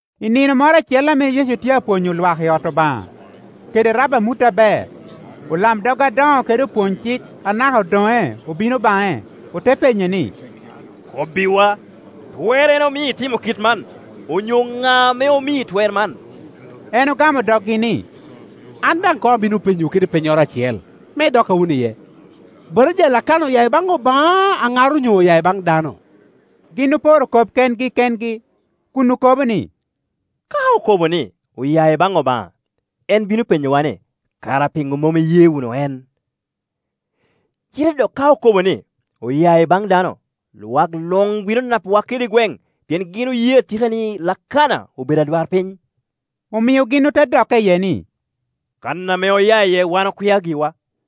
I nino moro acel ame Yecu tye apwonyo lwak i ot Obaŋa, kede rabo amut aber, olamdog adoŋo kede opwony-cik anaka odoŋe obino baŋe. Ote penye ni, “Kobbiwa, twerrene omio itimo kit man? Onyo ŋa ame omii twer man?” En ogamo doggi ni, “An daŋ koŋ abino penyowu kede pennyoro acel, me idokka wunu iye. Batija a Lakana oya i baŋ Obaŋa, aŋar onyo oya i baŋ dano?” Gin oporo kop kengi kengi, kun okobo ni, “Ka okobo ni, ‘Oya i baŋ Obaŋa,’ en bino penyowa ni, ‘Kara piŋo mom iye wunu en?’ Cite dok ka okobo ni, ‘Oya i baŋ dano,’ lwak luŋ bino napowa kede gweŋ, pien gin oye atika ni Lakana obedo adwarpiny.” Omio gin ote dokke iye ni, “Kan ame oya iye wan okwia giwa.”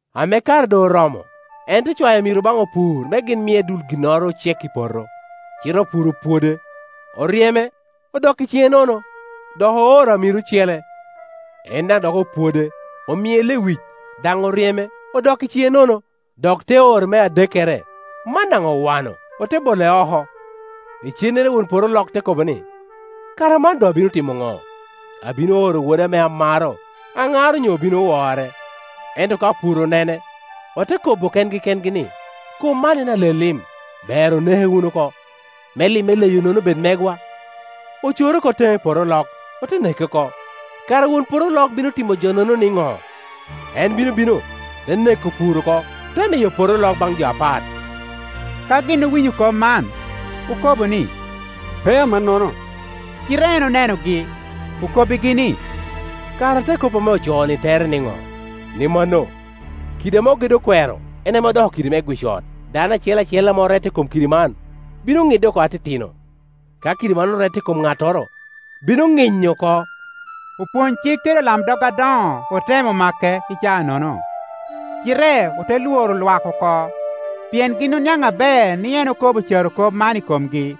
Ame kare doŋ oromo, en te cwayo amiro baŋ opur me gin mie dul ginnoro ocek i poto. Cite opur opwode, oryeme, odok i ciŋe nono. Dok ooro amiro ocele; en daŋ dok opwode, omie lewic, daŋ oryeme, odok i ciŋe nono. Dok te oro me adekkere; man daŋ owano, ote bole oko, lcennere won poto olok te kobo ni, ‘Kara man doŋ abino timo ŋo? Abino oro woda ame amaro; aŋar onyo obino wore.’ Ento ka opur onene, ote kobo kengi kengi ni, ‘Kom man en ale-lim; ber oneke wunu oko, me lim eleyo-nono bed megwa.’ Ocore oko teŋe i poto olok, ote neke oko. Kara won poto olok bino timo jonono niŋo? En bino bino, te neko opur-ru oko, te miyo poto olok baŋ jo apat.” Ka gin owinyo kop man, okobo ni, “Pe amannono!” Cite en onenogi, okobbigi ni, “Kara te kop ame ocooni tere niŋo, ni mano, ‘Kidi ame ogedo okwero en ame odoko kidi me gwic ot?’ Dano acel acel ame orette i kom kidi man bino ŋidde oko atitino; ka kidi man orette i kom ŋattoro, bino ŋinyo oko.” Opwony-cik kede olamdog adoŋo otemo make i caanono, cite ote lworo lwak oko; pien gin oniaŋ aber ni en okobo carokop man i komgi.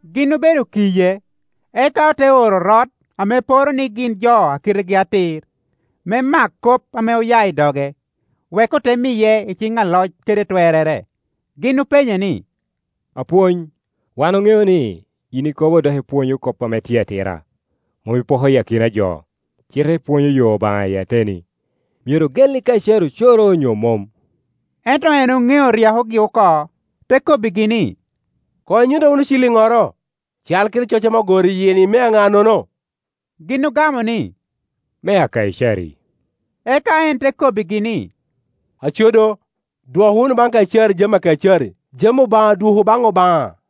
Gin obedo kiye, eka ote oro orot ame poro ni gin jo a kitegi atir, me mak kop ame ya i doge, wek ote miye i ciŋ aloc kede twerrere. Gin openye ni, “Apwony, wan oŋeo ni yin ikobo dok ipwonyo kop ame tye atira, mom ipoko akina jo, cite ipwonyo yo Obaŋa i ateni. Myero ogelli Kaicari ocoro, onyo mom?” Ento en oŋeo ryekogi oko, te kobbigi ni, “Koŋ inyutta wunu ciliŋŋoro. Cal kede coc ame ogoro i yie-ni mea ŋa-nono?” Gin ogamo ni, “Mea Kaicari.” Eka en te kobbigi ni, “Aco do, dwok wunu baŋ Kaicari jami a Kaicari, jami Obaŋa dwoku baŋ Obaŋa.”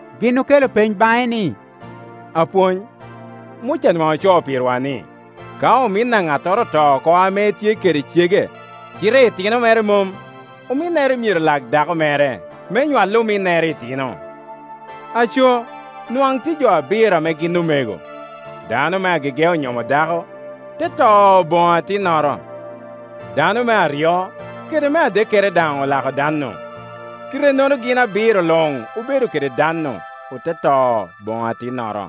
Gin okelo peny baŋe ni, “Apwony, Muca nwaŋ ocoo pirwa ni, ka omin a ŋattoro oto oko ame etye kede cege cite itino mere mom, ominnere myero lak dako mere me nywal ominnere itino. Aco, nwaŋ tye jo abiro ame gin omego. Dano me agege onyomo dako, te to boŋo atinnoro. Dano me aryo, kede me adekkere daŋ olako dan-nu; kite-nono gin abiro luŋ obedo kede dannu, ote to boŋo atinnoro.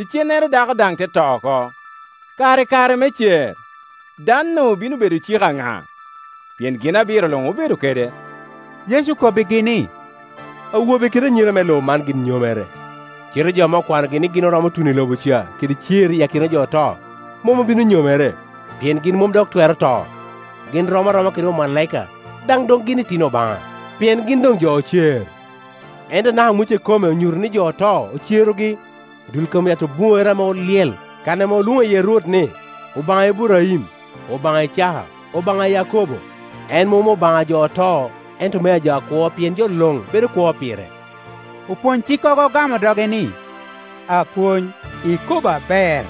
Icennere dako daŋ te to oko. Kara i kare me cer, da-nu bino bedo cik a ŋa? Pien gin abiro luŋ obedo kede.” Yecu okobbigi ni, “Awobe kede anyira me lobo man gin nyomere, cite jo ame okwanogi ni gin oromo tuno i lobo ca, kede cer iyi akina jo oto, mom obino nyomere, pien gin mom dok twero to. Gin rom aroma kede omalaika; daŋ doŋ gin itino Obaŋa, pien gin doŋ jo ocer. Ento anaka Muca ikome onyuto ni jo oto ocerogi, i dul i kom yat obuŋere ame olyel, kan ame olwoŋo iye Rwot ni, Obaŋa Iburaim, Obaŋa Icaka, Obaŋa a Yakobo. En mom Obaŋa ajo oto, ento meajo akwo; pien jo luŋ bedo kwo pire.” Opwonycikkogo ogamo doge ni, “Apwony, ikobo aber.”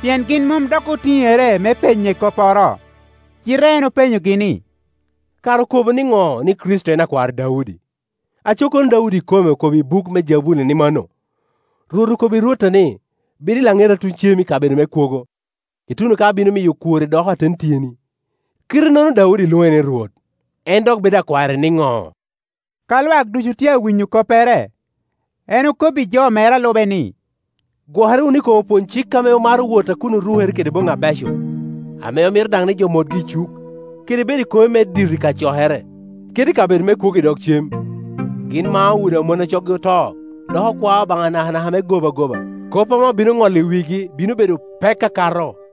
Pien gin mom dok otiŋere me penye kopporo. Cite en openyogi ni, “Kara okobo niŋo ni Kricito en akwar Daudi? Aco kono Daudi ikome okobo i buk me Jabuli ni mano, ‘Rwot okobbi Rwotta ni, Bed i laŋeta tuŋ cem i kabedo me kwogo, ituno ka abino miyo okworri doko aten tyeni.’ Kite-nono Daudi lwoŋe ni Rwot; en dok bedo akware niŋo?” Ka lwak ducu tye a winyo koppere, en okobbi jo mere a lube ni, “Gwokere wunu i kom opwony-cik ame maro wot a kun orukere kede boŋŋi abeco, ame omito daŋ ni jo motgi i cuk, kede bedo i kome me dito i kacokere, kede i kabedo me kwogo i dog cem. Gin mao udi a mon a coggi oto, dok okwao Obaŋa nakanaka me gobagoba. Kop ame obino ŋolo i wigi bino bedo pek akato.”